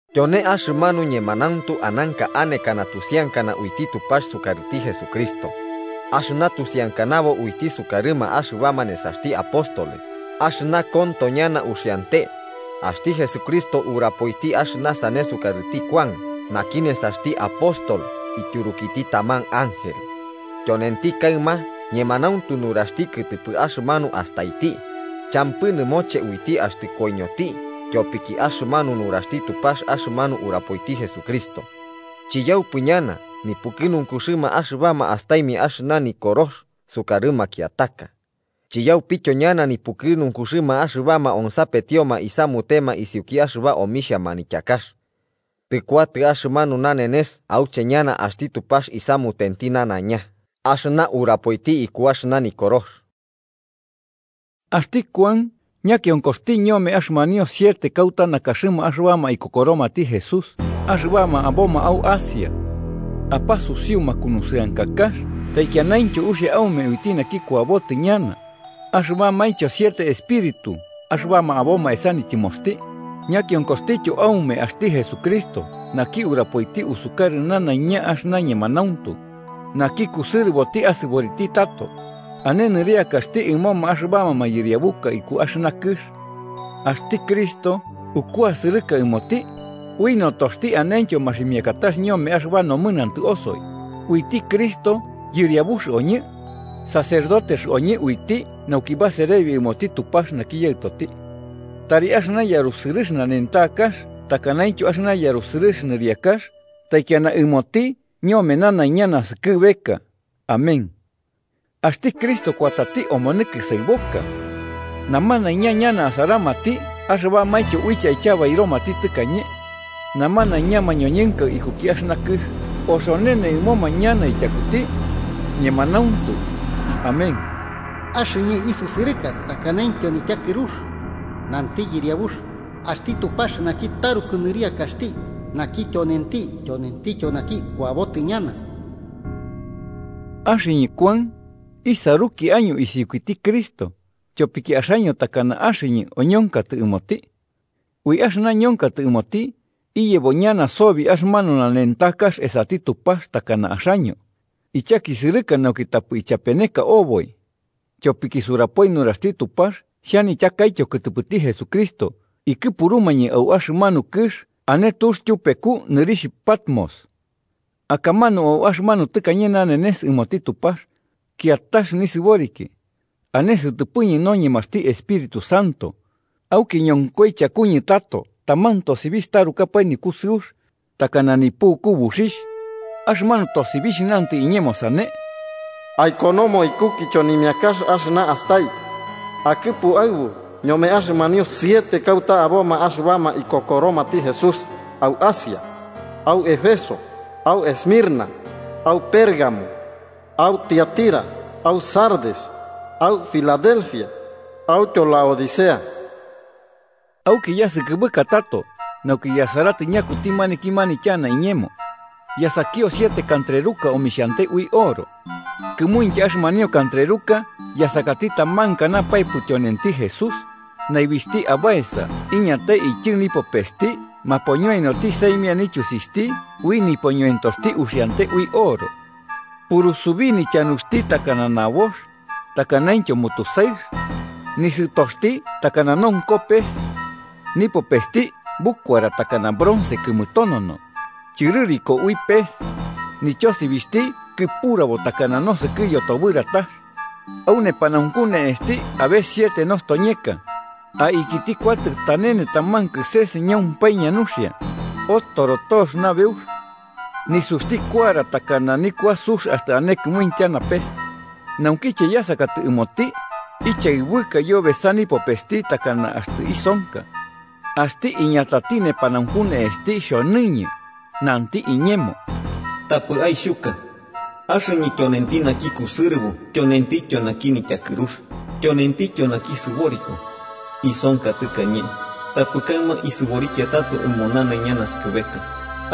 Tyone axɨmanu ñemanauntu ananka anekana tusiankana uiti Tupax sukarɨti Jesucristo, axɨna tusiankanabo uiti sukarɨma axɨbama nesaxti apóstoles axɨna konto ñana uxiante. Axti Jesucristo urapoiti axɨna sane sukarɨti Kuan naki nesaxti apóstol ityurukiti taman ángel, tyonenti kaɨma ñemanauntu nuraxti kɨtɨpɨ axɨmanu astaiti, champɨ nɨmoche uiti axtɨ koiñoti tyopiki axɨmanu nuraxti Tupax axɨmanu urapoiti Jesucristo. Chiyaupɨ ñana nipukɨnunkuxɨma axɨbama astaimia axɨna Nikorox sukarɨ makiataka, chiyaupityo ñana nipukɨnunkuxɨma axɨbama onsapetioma isamutema isiuki axɨba omixhia manityakax. Tɨkuatɨ axɨmanu nanenes auche ñana axti Tupax isamutenti nanaiña axɨna urapoiti iku axɨna Nikorox. Axti Kuan ñakionkoxti ñome axɨmanio siete kauta nakaxɨma axɨbama ikokoromati Jesús axɨbama aboma au Asia. Apasusiu makunusɨankakax taikianaintyo uxia aume uiti naki kuabotɨ ñana, axɨbamaintyo siete espíritu axɨbama aboma esa nityɨmoxti, ñakionkoxtityo aume axti Jesucristo naki urapoiti usukarɨ nanaiña axɨna ñemanauntu, naki kusɨrɨboti asɨboriti tato, ane nɨriakaxti ɨmoma axɨbama mayɨriabuka iku axɨna kɨx. Axti Cristo ukuasɨrɨka ɨmoti, ui notoxti anentyo maximiakatax ñome axɨba nomɨnantɨ osoi, uiti Cristo yɨriabux oñɨ, sacerdotes oñɨ uiti nauki baserebi ɨmoti Tupax naki Yaɨtoti. ¡Tari axɨna yarusɨrɨx nanentakax takanaintyo axɨna yarusɨrɨx nɨriakax taikiana ɨmoti ñome nanaiña naskɨbeka! Amén. ¡Axti Cristo kuatati omonɨ kɨsaɨboka! Namanaiña ñana asaramati axɨbamaintyo uiche aityabairomati tɨkañe. Namanaiña mañoñɨnka ikuki axɨna kɨx oxonene ɨmoma ñana tyakuti. Ñemanauntu, Amén. “Axɨñɨ isusɨrɨka takanaintyo nityakɨrux,” nanti Yɨriabux, axti Tupax naki taruku nɨriakaxti, naki tyonenti, tyonentityo naki kuabotɨ ñana. Axɨñɨ Kuan, isaruki año isiukiti Cristo, tyopiki axaño takana axɨñɨ oñonkatɨ ɨmoti. Ui axɨna ñonkatɨ ɨmoti, iyebo ñana sobi axɨmanu nanentakax esati Tupax takana axaño, ichakisɨrɨka nauki tapɨ ichapeneka oboi. Tyopiki surapoi nuraxti Tupax xhanityakaityo kɨtɨpɨti Jesucristo ikɨpurumañɨ au axɨmanu kɨx ane tux tyupeku nɨrixh Patmos. Akamanu au axɨmanu tɨkañe nanenes ɨmoti Tupax, kiatax nisɨboriki (ane sɨtɨpɨñɨ noñemaxti Espíritu Santo). Auki ñonkoi chakuñɨ tato taman tosibixh tarukapae nikusɨux, takana nipuku buxixh. Axɨmanu tosibixh nantɨ iñemo sane: “Aikonomo iku kichonimiakax axɨna astai, akɨpu aɨbu ñome axɨmanio siete kauta aboma axɨbama ikokoromati Jesús au Asia: au Éfeso, au Esmirna, au Pérgamo, au Tiatira, au Sardes, au Filadelfia, autyo Laodicea.” Auki yasɨkɨbɨka tato, nauki yasarai ñakuti maniki manityana iñemo. Yasakio siete kantreruka omixhante ui oro. Kɨmuintya axɨmanio kantreruka yasakati taman kanapaepɨ tyonenti Jesús, naibixhti abaesa iñatai ityɨ nipopesti mapoñoenoti saimia nityusixhti ui nipoñoentoxti uxiante ui oro. Purusubi nityanuxti takana nabox, takanaintyo mutusaɨx, nisɨtoxti takana nonko pes. Nipopesti bukuara takana bronce kɨmɨtonono, chɨrɨriko ui pes. Nityosibixhti kɨpurabo takana nosɨkɨ yotobɨratax. Au nepanaunku ne'esti abe siete nostoñeka, aikiti kuatɨ tanene taman kɨses ñaupaña nuxia, otoro tox nabeux. Nisuxti kuara takana nikua sux axtɨ ane kɨmuitya napes. Naukiche yasakatɨ ɨmoti, ichaɨbɨka yobesa nipopesti takana axtɨ isonka. Axti iñatati nepanaunku ne'esti xhonɨñɨ, nanti iñemo: “Tapɨ aixhuka. Axɨñɨ tyonenti naki kusɨrɨbo tyonentityo naki nityakɨrux, tyonentityo naki sɨboriko. Isonka tɨkañe, tapɨ kaɨma isɨborikia tato ɨmo nanaiña naskɨbeka,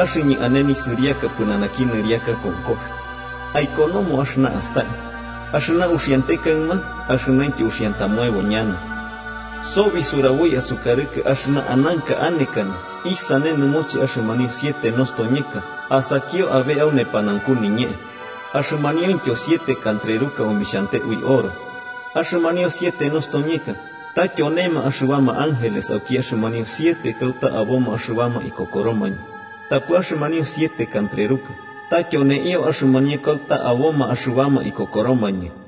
axɨñɨ ane nisɨriaka pɨnanaki nɨriaka konkox. Aikonomo axɨna astai: axɨna uxiante kaɨma axɨnaintyo uxiantamoebo ñana. Sobi suraboi asukarɨkɨ axɨna ananka anekana isane nɨmoche axɨmanio siete nostoñeka asakio abe au nepanaunku niñee, axɨmaniointyo siete kantreruka omixhante ui oro: axɨmanio siete nostoñeka, ta tyonema axɨbama ángeles auki axɨmanio siete kauta aboma axɨbama ikokoromañɨ, tapɨ axɨmanio siete kantreruka, ta tyoneio axɨmanio kauta aboma axɨbama ikokoromañɨ.